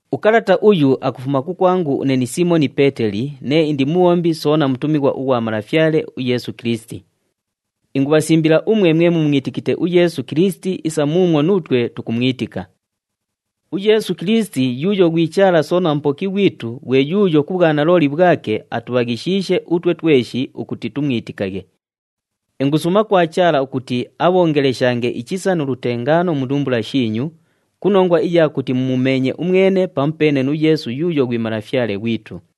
Ukalata uyu akufuma kukwangu une ni Siimoni Peeteli nee indi mubhombi soona mutumighwa ughwa Malafyale uYeesu Kilisiti. Ingubhasimbila umwe mwe mumwitikite uYeesu Kilisiti isa muumwo nuutwe tukumwitika. UYeesu Kilisiti yuuyo ghwi Chaala soona Mupoki ghwitu ghwe yuuyo ku bhwanalooli bhwake atubhaghishiishe utwe tweshi ukuti tumwitikaghe. Ingusuuma kwa Chaala ukuti abhoongeleshange ichisa nu lutengaano mu ndumbula shiinyu, ku nongwa iya kuti mumumeenye umwene pamupeene nu Yeesu yuuyo ghwi Malafyale ghwitu.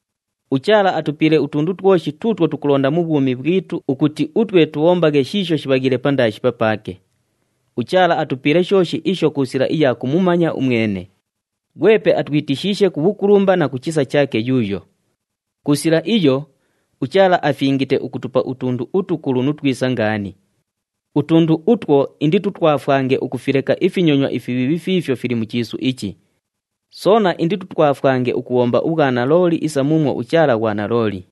UChaala atupiile utundu twoshi tuutwo tukulonda mu bhwumi bhwitu ukuti utwe tubhombaghe shiisho shibhaghiile pandaashi papaake. UChaala atupiile shooshi isho ku sila iya kumumanya umwene, ghwepe atwitishiishe ku bhukulumba na ku chisa chaake yuuyo. Ku sila iyo, uChaala afingite ukutupa utundu utukulu nu twisa ngaani. Utundu utwo inditutwafwange ukufileka ifinyonywa ifibhiibhi fiifyo fili mu chiisu ichi. Soona inditutwafwange ukubhomba ubhwanalooli isa muumwo uChaala ghwanalooli.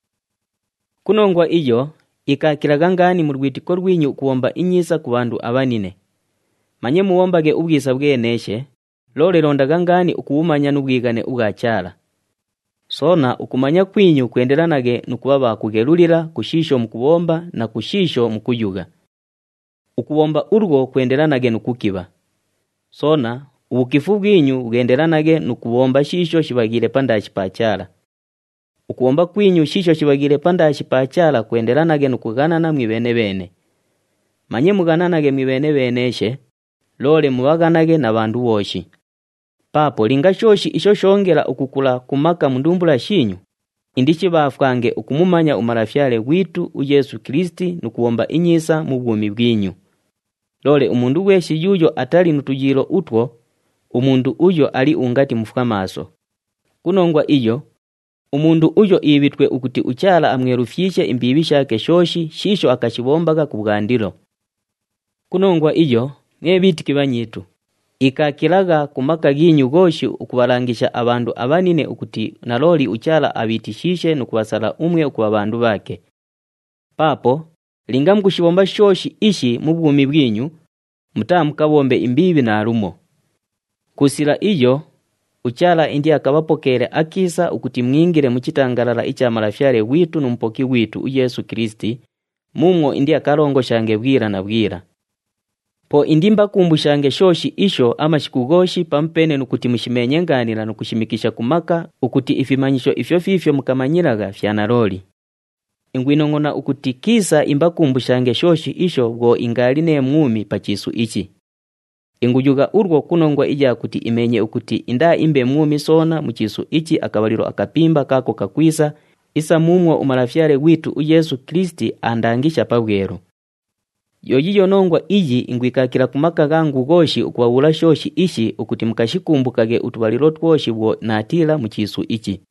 Ku nongwa iyo, ikaakilagha ngaani mu lwitiko lwinyu ukubhomba inyiisa ku bhandu abhanine. Manye mubhombaghe ubhwisa bhweneeshe, loole londagha ngaani ukubhumanya nu bhwighane ubhwa Chaala. Soona ukumanya kwinyu kwendelanaghe nu kubha bha kughelulila ku shiisho mukubhomba na ku shiisho mukuyugha. Ukubhomba ulwo kwendelanaghe nu kukibha. Soona, ubhukifu bhwinyu bhwendelanaghe nu kubhomba shiisho shibhaghiile pandaashi pa Chaala. Ukubhomba kwinyu shiisho shibhaghiile pandaashi pa Chaala kwendelanaghe nu kughanana mwibheene-bheene. Manye mughananaghe mwibheene-bheeneeshe, loole mubhaghanaghe na bhandu bhooshi. Paapo linga shooshi isho shoongela ukukula ku maka mu ndumbula shiinyu, indishibhaafwange ukumumanya uMalafyale ghwitu uYeesu Kilisiti nu kubhomba inyiisa mu bhwumi bhwinyu. Loole umundu ghweshi yuuyo atali nu tuyiilo utwo, umundu uyo ali ungati mufwamaaso. Ku nongwa iyo, umundu uyo iibhitwe ukuti uChaala amwelufyishe imbiibhi shaake shooshi shiisho akashibhombagha kubhwandilo. Ku nongwa iyo, mwe bhiitiki bhanyiitu, ikaakilagha ku maka ghiinyu ghooshi ukubhalangisha abhandu abhanine ukuti nalooli uChaala abhiitishiishe nu kubhasala umwe ukubha bhandu bhaake. Paapo linga mukushibhomba shooshi ishi mu bhwumi bhwinyu, mutaamukabhombe imbiibhi naalumo. Ku sila iyo, uChaala indiakabhapokeele akiisa ukuti mwingile mu chitangalala icha Malafyale ghwitu nu Mupoki ghwitu uYeesu Kilisiti, muumwo indiakalongoshange bhwila na bhwila. Po indiimbakumbushange shooshi isho amashiku ghooshi pamupeene nu kuti mushimeenye ngaanila nu kushishimikisha ku maka ukuti ifimanyisho ifyo fiifyo mukamanyilagha fya nalooli. Ingwinongʼona ukuti kiisa imbakumbushange shooshi isho bhwo ingaali nee mwumi pa chiisu ichi. Inguyugha ulwo ku nongwa iya kuti imeenye ukuti indaaimbe mwumi soona mu chiisu ichi akabhalilo akapimba kaako kakwisa isa muumwo uMalafyale ghwitu uYeesu Kilisiti aandangisha pabhwelu. Yo yiiyo nongwa iyi ingwikaakila ku maka ghangu ghooshi ukubhabhuula shooshi ishi ukuti mukashikumbukaghe utubhalilo twoshi bhwo naatiila mu chiisu ichi.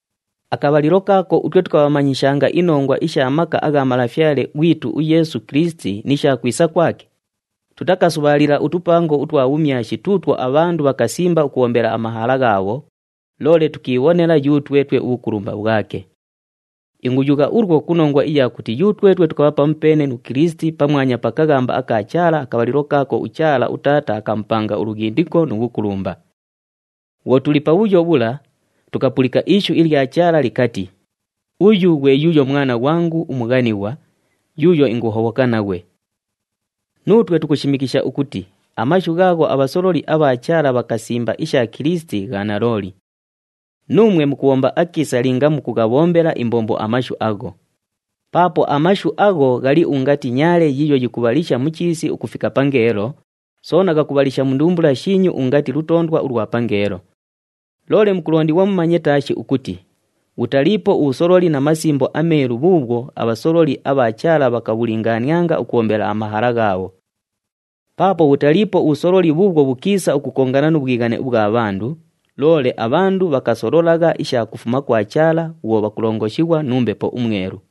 Akabhalilo kaako utwe tukabhamanyishanga inongwa isha maka agha Malafyale ghwitu uYeesu Kilisiti ni sha kwisa kwake, tutakasubhaalila utupango utwa bhumyashi tuutwo abhandu bhakasimba ukubhombela amahala ghaabho, loole tukiibhonela yutwetwe ubhukulumba bhwake. Inguyugha ulwo ku nongwa iya kuti yutwetwe tukabha pamupeene nu Kilisiti pamwanya pa kaghamba aka Chaala, akabhalilo kaako uChaala uTaata akamupanga ulughindiko nu bhukulumba. Bhwo tuli pabhuyo bhula, tukapulika ishu ilya Chaala likati, “Uyu ghwe yuuyo Mwana ghwangu umughanighwa, yuuyo inguhobhoka naghwe.” Nuutwe tukushimikisha ukuti amashu ghaagho abhasololi abha Chaala bhakasimba isha Kilisiti gha nalooli. Nuumwe mukubhomba akiisa linga mukughabhombela imbombo amashu agho. Paapo amashu agho ghali ungati nyaale yiiyo yikubhalisha mu chiisi ukufika pangeelo, soona ghakubhalisha mu ndumbula shiinyu ungati lutoondwa ulwa pangeelo. Loole mukulondighwa mumanye taashi ukuti bhutaliipo ubhusololi mu Masimbo aMeelu bhuubhwo abhasololi abha Chaala bhakabhulingaanianga ukubhombela amahala ghaabho. Paapo bhutaliipo ubhusololi bhuubhwo bhukiisa ukukongana nu bhwighane ubhwa bhandu, loole abhandu bhakasololagha isha kufuma kwa Chaala bhwo bhakulongoshighwa nu Mbepo uMwelu.